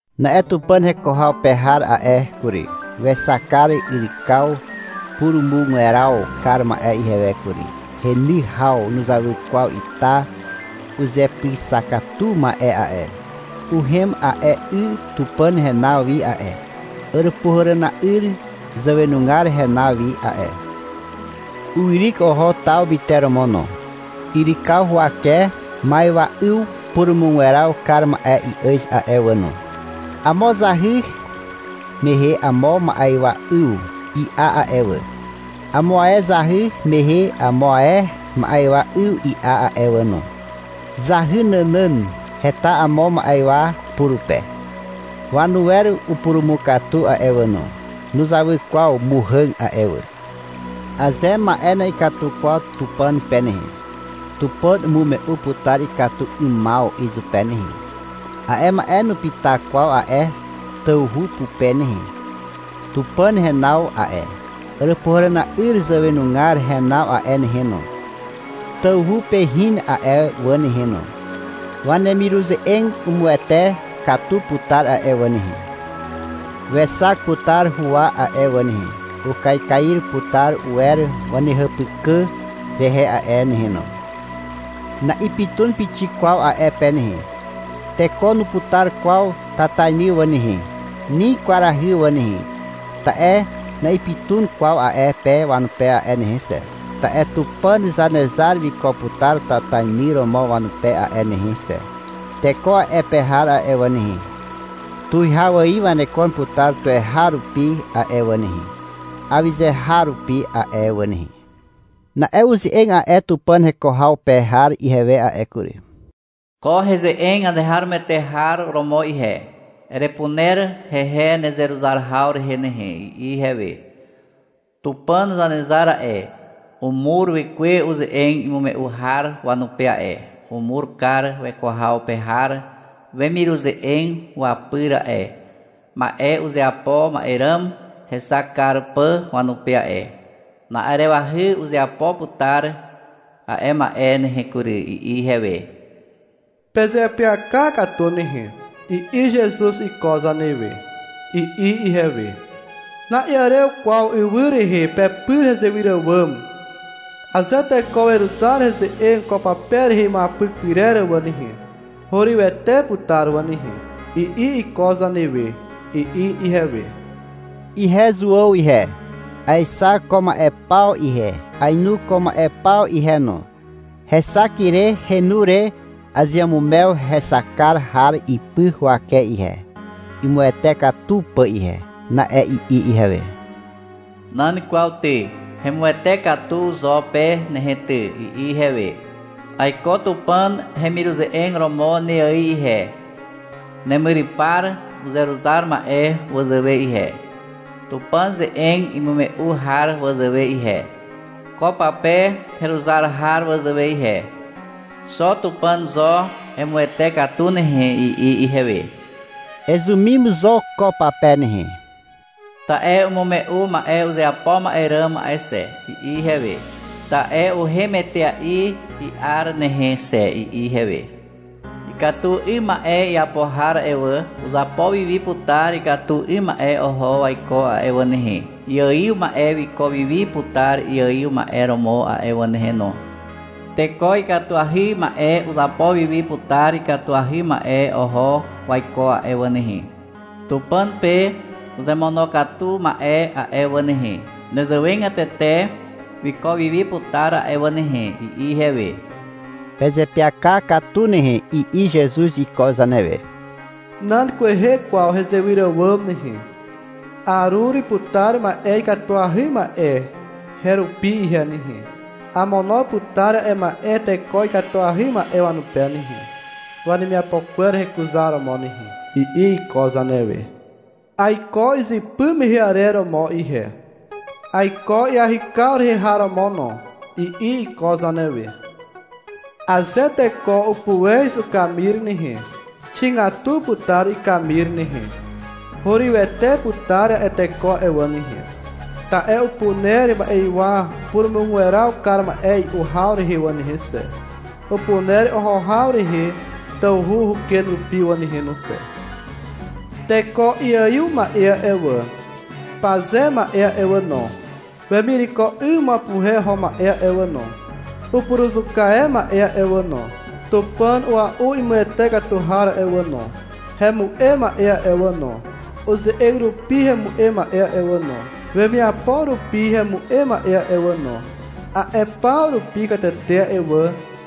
Na'e Tupàn heko haw pe har a'e kury, wexak kar yrykaw purumugweraw kar ma'e ihewe kury. Heny haw nuzawy kwaw ita uzepyxakatu ma'e a'e. Uhem a'e 'y Tupàn henaw wi a'e, Àràpuhàràna'yr zàwenugar henaw wi a'e. Uwyryk oho taw myteromo No. Yrykaw huwake ma'ywa'yw purumugweraw kar ma'e i'àz a'e wà no. Amo zahy mehe amo ma'ywa'yw i'a a'e wà. Amo ae zahy mehe amo ae ma'ywa 'yw i'a a'e wà no. Zahy nànàn heta amo ma'ywa purupe. Wanuwer upurumukatu a'e wà no. Nuzawy kwaw muhàg a'e wà. Aze ma'e na'ikatu kwaw Tupàn pe nehe, Tupàn umume'u putar ikatu 'ymaw izupe nehe. A'e ma'e nupyta kwaw a'e tawhu pupe nehe. Tupàn henaw a'e, Àràpuhàràna'yr zàwenugar henaw a'e nehe no, tawhu pe hin a'e wà nehe no. Wanemiruze'eg umuwete katu putar a'e wà nehe. Wexak putar huwa a'e wà nehe. Ukaikair putar uwer wanehàpykà rehe a'e nehe no. Na'ipytun pixik kwaw a'e pe nehe. Teko nuputar kwaw tatainy wà nehe, ni kwarahy wà nehe, ta'e na'ipytun kwaw a'e pe wanupe a'e nehe xe. Ta'e Tupàn Zanezar wiko putar tatainy romo wanupe a'e nehe xe. Teko a'e pe har a'e wà nehe, tuwihaw ài wanekon putar tuweharupi a'e wà nehe, awyze har rupi a'e wà nehe. Na'e uze'eg a'e Tupàn heko haw pe har ihewe a'e kury. — Ko heze'eg azeharomoete har romo ihe. Erepuner hehe nezeruzar haw rehe nehe, i'i ihewe. — Tupàn Zanezar a'e, umur Wekwe uze'eg imume'u har wanupe a'e, umur kar weko haw pe har wemiruze'eg wapyr a'e, ma'e uzeapo ma'e ràm hexak kar pà wanupe a'e. Na'arewahy uzeapo putar a'e ma'e nehe kury, i'i ihewe. — Pezeapyaka katu nehe, i'i Zezuz iko zanewe, i'i ihewe. — Na'iàrew kwaw ywy rehe pepyr hezewyr àwàm. Aze teko weruzar heze'eg ko pape rehe imuapyk pyrer wà nehe, hurywete putar wà nehe, i'i iko zanewe, i'i ihewe. Ihe Zuàw ihe, aexak ko ma'e paw ihe, ainu ko ma'e paw ihe no. Hexak ire henu re azeamumew hexak kar har ipy huwake ihe, imuwete katu pà ihe. Na'e i'i ihewe. — Nan kwaw ty, hemuwete katu zo pe nehe ty, i'i ihewe. — Aiko Tupàn hemiruze'eg romo ne ài ihe, nemyrypar uzeruzar ma'e wazàwe ihe, Tupàn ze'eg imume'u har wazàwe ihe, ko pape heruzar har wazàwe ihe. Xo Tupàn zo emuwete katu nehe, i'i ihewe. — Ezumim zo ko pape nehe. Ta'e umume'u ma'e uzeapo ma'e ràm a'e xe, i'i ihewe. — Ta'e uhem etea'i i'ar nehe xe, i'i ihewe. — Ikatu 'ym ma'e iapo har a'e wà, uzapo wi wi putar ikatu 'ym ma'e oho waiko a'e wà nehe. Iaiw ma'e wiko wi wi putar iaiw ma'e romo a'e wà nehe no. Teko ikatuahy ma'e uzapo wi wi putar ikatuahy ma'e oho waiko a'e wà nehe. Tupàn pe uzemonokatu ma'e a'e wà nehe, nezewegatete wiko wi wi putar a'e wà nehe, i'i ihewe. — Pezeapyaka katu nehe, i'i Zezuz iko zanewe. — Nan kwehe kwaw hezewyr àwàm nehe. Arur putar ma'e ikatuahy ma'e herupi ihe nehe. Amono putar a'e ma'e teko ikatuahy ma'e wanupe nehe, wanemiapo kwer hekuzaromo nehe, i'i iko zanewe. — Aiko izypy mehe arer romo ihe. — Aiko iahykaw rehe har romo no, i'i iko zanewe. — Aze teko upuez ukamir nehe, xigatu putar ikamir nehe. Hurywete putar a'e teko a'e wà nehe. Ta'e upuner ma'ywa purumugweraw kar ma'e i'u haw rehe wà nehe xe. Upuner oho haw rehe tawhu uken rupi wà nehe no xe. Teko iaiw ma'e a'e wà, paze ma'e a'e wà no, wemireko 'ym wapuhe oho ma'e wà no, upuruzuka e ma'e a'e wà no, tupàn ua'u imuwete katu har a'e wà no, hemu'em ma'e a'e wà no, uze'eg rupi hemu'em ma'e a'e wà no, wemiapo rupi hemu'em ma'e a'e wà no, a'e paw rupi katete a'e wà,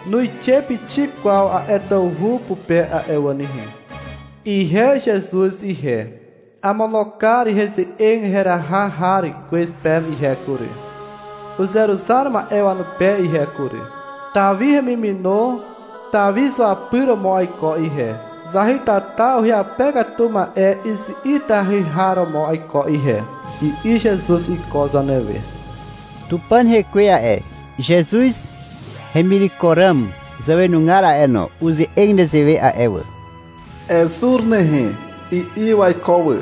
nuixe pixik kwaw a'e tawhu pupe a'e wà nehe. — Ihe Zezuz ihe, amono kar heze'eg heraha har kwez peme ihe kury, uzeruzar ma'e wanupe ihe kury. Tawi hemimino Tawi zuapyr romo aiko ihe. Zahytata uhyape katu ma'e izi'itahy har romo aiko ihe, i'i Zezuz iko zanewe. Tupàn Hekwe a'e, Zezuz hemireko ràm zàwenugar a'e no, uze'eg nezewe a'e wà. — Ezur nehe, i'i waiko wà.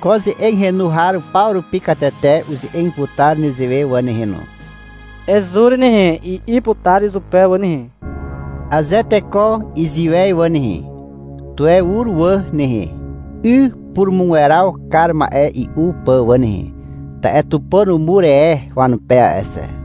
Ko ze'eg henu har paw rupi katete uze'eg putar nezewe wà nehe no, — Ezur nehe, i'i putar izupe wà nehe. Aze teko iziwez wà nehe, tuwe ur wà nehe, 'y purumugweraw kar ma'e i'u pà wà nehe. Ta'e Tupàn umur e wanupe a'e xe.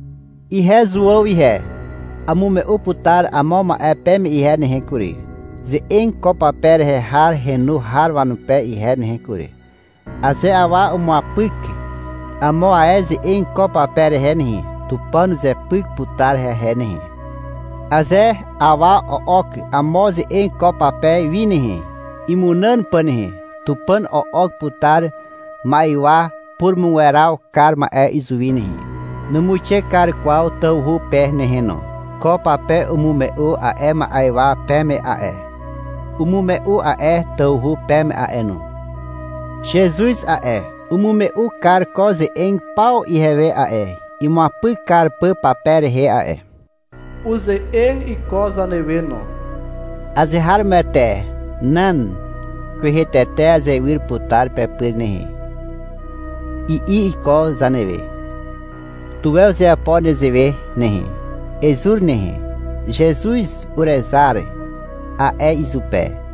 Ihe, Zuàw, ihe. Amume'u putar amo ma'e peme ihe nehe kury, ze'eg ko pape rehe har henu har wanupe ihe nehe kury. Aze awa umuapyk amo ae ze'eg ko pape rehe nehe, Tupàn uzepyk putar hehe nehe. Aze awa o'ok amo ze'eg ko pape wi nehe, imunàn pà nehe, Tupàn o'ok putar ma'ywa purumugweraw kar ma'e izuwi nehe. Numuixe kar kwaw tawhu pe nehe no. Ko pape umume'u a'e ma'ywa peme a'e, umume'u a'e tawhu peme a'e no. Zezuz a'e, umume'u kar ko ze'eg paw ihewe a'e, imuapyk kar pà pape rehe a'e. Uze'eg iko zanewe no. — Azeharomoete, nan kwehe tete azewyr putar pepyr nehe, i'i iko zanewe. Tuwe uzeapo nezewe nehe. — Ezur nehe, Zezuz urezar, a'e izupe.